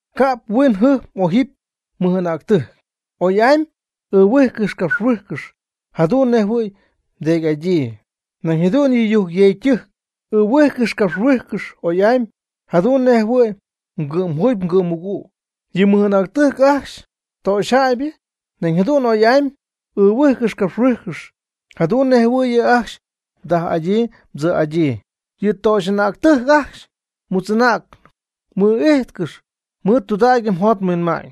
Ca'p huinjɨjp m'ojɨp mɨj'anäctɨjc. Oy'amy ɨɨhuijcɨxy capxhuijcɨxy jadu'n nej jɨhuɨ̈y mdeedy'adyii. Nañ jadu'n yɨ yujcyeecytɨjc ɨɨhuijcɨxy capxhuijcɨxy oy'amy jadu'n nej jɨhuɨ̈y mgɨ'mjuugy mgɨ'mmɨgüg. Yɨ mɨj'anäctɨjc ajcxy töxyjäybɨ nañ jadu'n oy'amy m'ɨɨhuijcɨxy capxhuijcɨxy, jadu'n nej jɨhuɨ̈y yɨ' ajcxy mdaj'adyii mdzïtz'adyii. Yɨ töxy'anäctɨjc ajcxy mutz'anäcnɨp mɨɨd'ijtcɨxy mɨɨd tudägyɨ mjot mhuinma'ñ.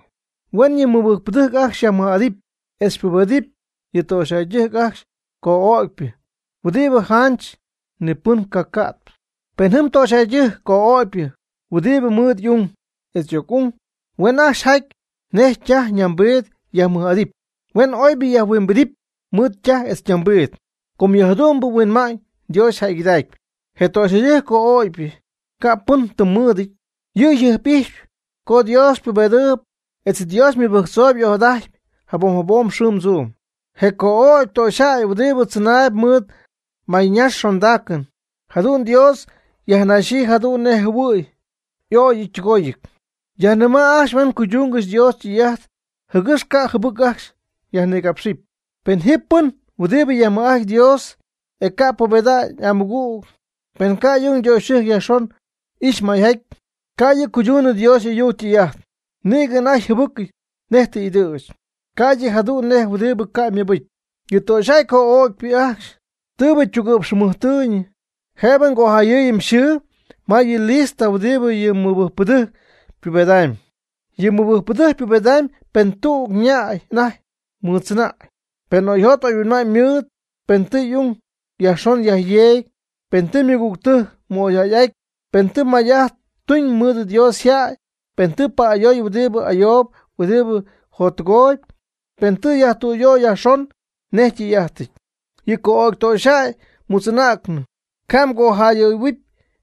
Huen yɨ mɨbɨjcpɨdɨjc ajcxy yajmɨj'adɨpy etz pubedɨpy yɨ töxyjäydɨjc ajcxy co'ögypɨ, huɨdibɨ janch ni ypɨn ycaca'ty. Pen jɨm töxyjäydɨjc co'ögpyɨ huɨdibɨ mɨɨd y'ung etz y'oc'ung, huen ajcxy jaty nej ytaj ñambiid yajmɨj'adɨpy, huen oybɨ yajhuimbidɨpy mɨɨd ytaj etz ñambiid. Com yɨ jadu'mbɨ huinma'ñ Dios yjäygɨdacpy. Je töxyjäy co'ögypɨ ca'p pɨn tɨm mɨɨdɨty, yɨ' yjɨjp'ijxyp co Dios ypubedɨɨyb etz Dios ymɨbɨjctzooyb y'ojadajtpy jabom jabom xɨɨm tzuum. Je co'ögy töxyjäy huɨdibɨ tzɨnaayb mɨɨd mayñax xondaacɨn, jadu'n Dios yajnaxyii jadu'n nej jɨhuɨ̈y y'ögɨty ytɨgoyɨty. Yajnɨma' ajcxy huen cuydungɨxy Dios ytɨy'ajt, jɨgɨx ca' jɨbɨc ajcxy yajnigapxy. Pen ji pɨn huɨdibɨ yajmɨj'ajtp Dios, e ca' pubeda'ñ y'amɨgüg, pen ca' y'ung ytöxyɨjc yajxon ixy may'aty, ca' yɨ' cuydunɨ Dios y'ayuc ytɨy'ajt. Nïgɨ anajty yjɨbɨcɨty nej tɨ y'ɨdɨ̈ch ca'ydɨ jadu'n nej huɨdibɨ ca' ymɨbɨcy. Yɨ töxyjäy co'ögypɨ ajcxy tɨɨbɨ ytugɨ'px jɨmɨjtɨ̈y, jëbɨ mgojayɨɨyɨ yxɨɨ ma yɨ lista huɨdibɨ yɨ mɨbɨjcpɨdɨjc ypubedamyb. Yɨ mɨbɨjcpɨdɨjc ypubedamyb pen tüg ñäy anajty mɨɨddzɨnäy, pen oyjot oyhuinma'ñ ymɨɨd, pen tɨ y'ung yajxon yajyeegy, pen tɨ mɨgügtɨjc mɨ'oyjäy'aty, pen tɨ may'ajt tuñ mɨɨd Dios yjäy, pen tɨ pa'ayooy huɨdibɨ ayoob huɨdibɨ jottɨgooyb, pen tɨ yajtüyöy yajxon nej ytɨy'ajtɨty. Yɨ co'ögy töxyjäy mutz'anäcnɨbɨ ca' mgojayɨɨyɨpy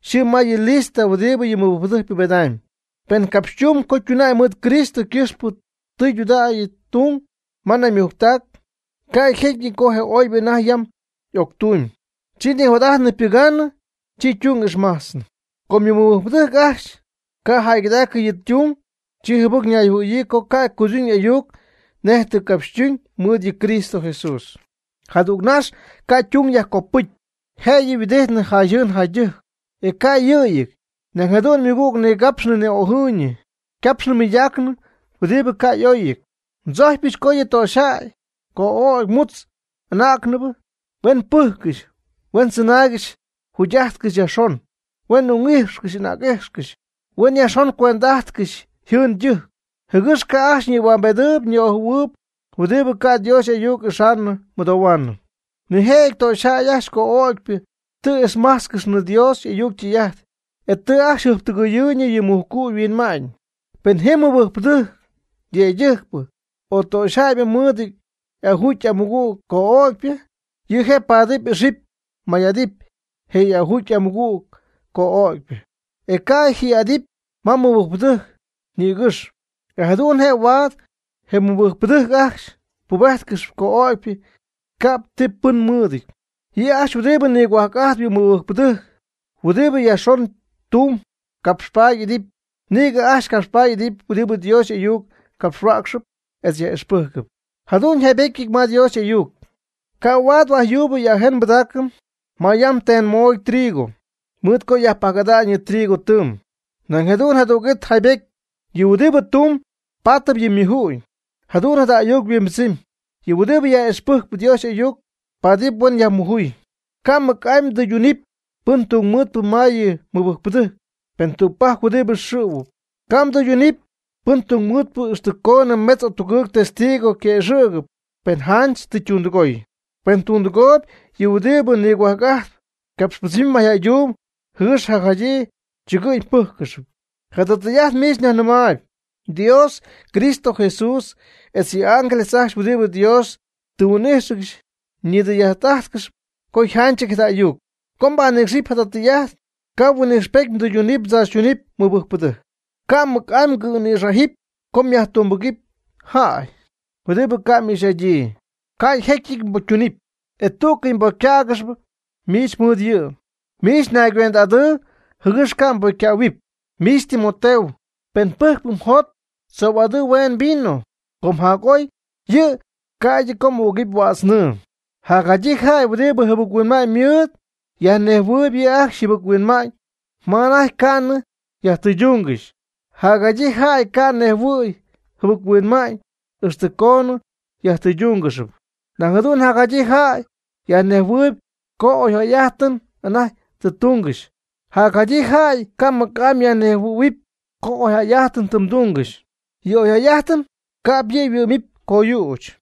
yxɨɨ ma yɨ lista huɨdibɨ yɨ mɨbɨjcpɨdɨjc ypubedamyb. Pen capxytumb co tuna'ñ mɨɨd Cristo ycɨxpɨ tijaty tung ma naymujctac, ycajecyɨty co je oybɨ anajty yam y'octumyb, chi nijot'ajtnɨ ypɨgaanɨ, chi ytung ixmajtznɨp. Co yɨ mɨbɨjcpɨdɨjc ajcxy ca' jäygɨdaacɨ yɨ' ytung, chi jɨbɨc ñayjɨhuɨ̈yii co ca' cuyduñ y'ayuc nej tɨ ycapxytuñ mɨɨd yɨ Cristo Jesús. Jadügnax ca' ytung yajcopɨcy, jëyɨ yhuɨdijtnɨ jayjɨɨn jaydɨjc, e ca' yɨ'yɨty, nañ jadu'n ymɨgüg nigapxnɨ ni'ojɨɨyñɨ, capxnɨ mɨydaacnɨ huɨdibɨ ca' y'oyɨty. Ndzojcpyɨch co yɨ töxyjäy co'ögy mutz anäcnɨbɨ huen pɨjccɨxy, huen tzɨnaaygɨxy jugy'ajtcɨxy yajxon, huen ung'ijxcɨxy anäc'ijxcɨxy, huen yajxon cuend'ajtcɨxy yjɨɨn ytɨjc, jɨgɨx ca' ajcxy nïhuambedɨɨyb ni'ojɨ̈huɨɨyb huɨdibɨ ca' Dios y'ayuc ixaanɨ mɨdohuaanɨ. Nijëjɨty töxyjäy ajcxy co'ögypɨ tɨ ixmajtzcɨxnɨ Dios y'ayuc ytɨy'ajt, e tɨ ajcxy jɨjptɨgɨyɨ́ɨygɨxnɨ yɨ mujcu' yhuinma'ñ. Pen ji mɨbɨjcpɨdɨjc yëydɨjcpɨ o töxyjäybɨ mɨɨdɨty y'ajuugy y'amɨgüg co'ögypɨ, yɨ' je' paatɨp ixɨpy may'adɨpy je y'ajuugy y'amɨgüg co'ögypɨ, e ca' yaj'idɨpy ma yɨ mɨbɨjcpɨdɨjc nïgɨxp. E jadu'n je' huaad je mɨbɨjcpɨdɨjc ajcxy pubejtcɨxy co'ögypɨ ca'p ti tɨm mɨɨdɨty. Yɨ' ajcxy huɨdibɨ nigohuajc'ajtp yɨ mɨbɨjcpɨdɨjc huɨdibɨ yajxon tumb capxpaady y'idɨpy. Nïgɨ ajcxy capxpaady y'idɨpy huɨdibɨ Dios y'ayuc capxhuäcxɨp etz yaj'ixpɨcy. Jadu'n yjaybetyɨty ma Dios y'ayuc: “Ca' huaad huajyuub y'ajen nbɨdaacɨm ma yam ten moody trigo mɨɨy co yajpajc'ada'ñ yɨ trigo tɨɨm.” Nañ jadu'n jadüg'it yjaybetyɨty: “Yɨ huɨdibɨ tumb paatɨp yɨ' ymuju'ñ.” Jadu'n jada ayuc yhuimbɨdzɨmy: Yɨ' huɨdibɨ yaj'ixpɨjcp Dios y'ayuc paatɨp huen yajmujuy. Ca' mɨc'amy mdɨydunɨpy pɨn tungmɨɨdpɨ ma yɨ mɨbɨjcpɨdɨjc pen tügpajc huɨdibɨ xɨ̈huɨp. Ca' mdɨydunɨpy pɨn tungmɨɨdpɨ ixtɨ coonɨ metz o tugɨɨg testigo yquëxɨ̈gɨpy pen janch tɨ ytundɨgooy. Pen ytundɨgooy yɨ huɨdibɨ nigohuajc'ajtp, capxpɨdzɨm mayjäydumb jɨgɨx jacjadyii chɨgɨ'ñ pɨ́jccɨxɨpy. Jada tɨy'ajt miich nyajnɨmaayb, Dios Cristo Jesús etz yɨ' y'ángeles ajcxy huɨdibɨ Dios tɨ huin'ijxcɨxy ñidɨy'ajt'ajtcɨxy co yjanchɨty jada ayuc. Co mbanɨcxɨp jada tɨy'ajt, ca' huin'ixpety mdɨydunɨp mdzaachytunɨp mɨbɨjcpɨdɨjc. Ca' mɨc'amy mgɨ̈nïxajɨpy co myajtungbɨga'nɨp jäy huɨdibɨ ca' m'ixy'adyii. Ycajecyɨty ypocytunɨpy, e tú'cɨy mbocycähuaangɨxy miich mɨɨd yɨ'. Miich nayguend'adɨɨ jɨgɨx ca' mbocycähuɨpy. Miich Timoteo, pen pɨjcp mjot, tzoy'adɨɨ hueen vino, com jac'oy yɨ' ca'ydɨ co m'ügɨpy huädz nɨɨ. Jadyii jäy huɨdibɨ jɨbɨc-huinma'ñ mɨɨd yajnejhuɨ̈huɨpy yɨ' ajcxy yjɨbɨc-huinma'ñ ma anajty ca'nɨ yajtɨydungɨxy. Jacjadyii jäy ca' yajnejhuɨ̈y yjɨbɨc-huinma'ñ ixtɨ coonɨ yajtɨydungɨxy. Nañ jadu'n jadyii jäy yajnejhuɨ̈huɨp co oyjäy'ajtɨn anajty tɨ tungɨxy, jacjadyii jäy ca' mɨc'amy yajnejhuɨ̈huɨpy co oyjäy'ajtɨn tɨ tungɨxy. Yɨ oyjäy'ajtɨn ca'p yɨ' yhuɨ'mɨpy coyüch.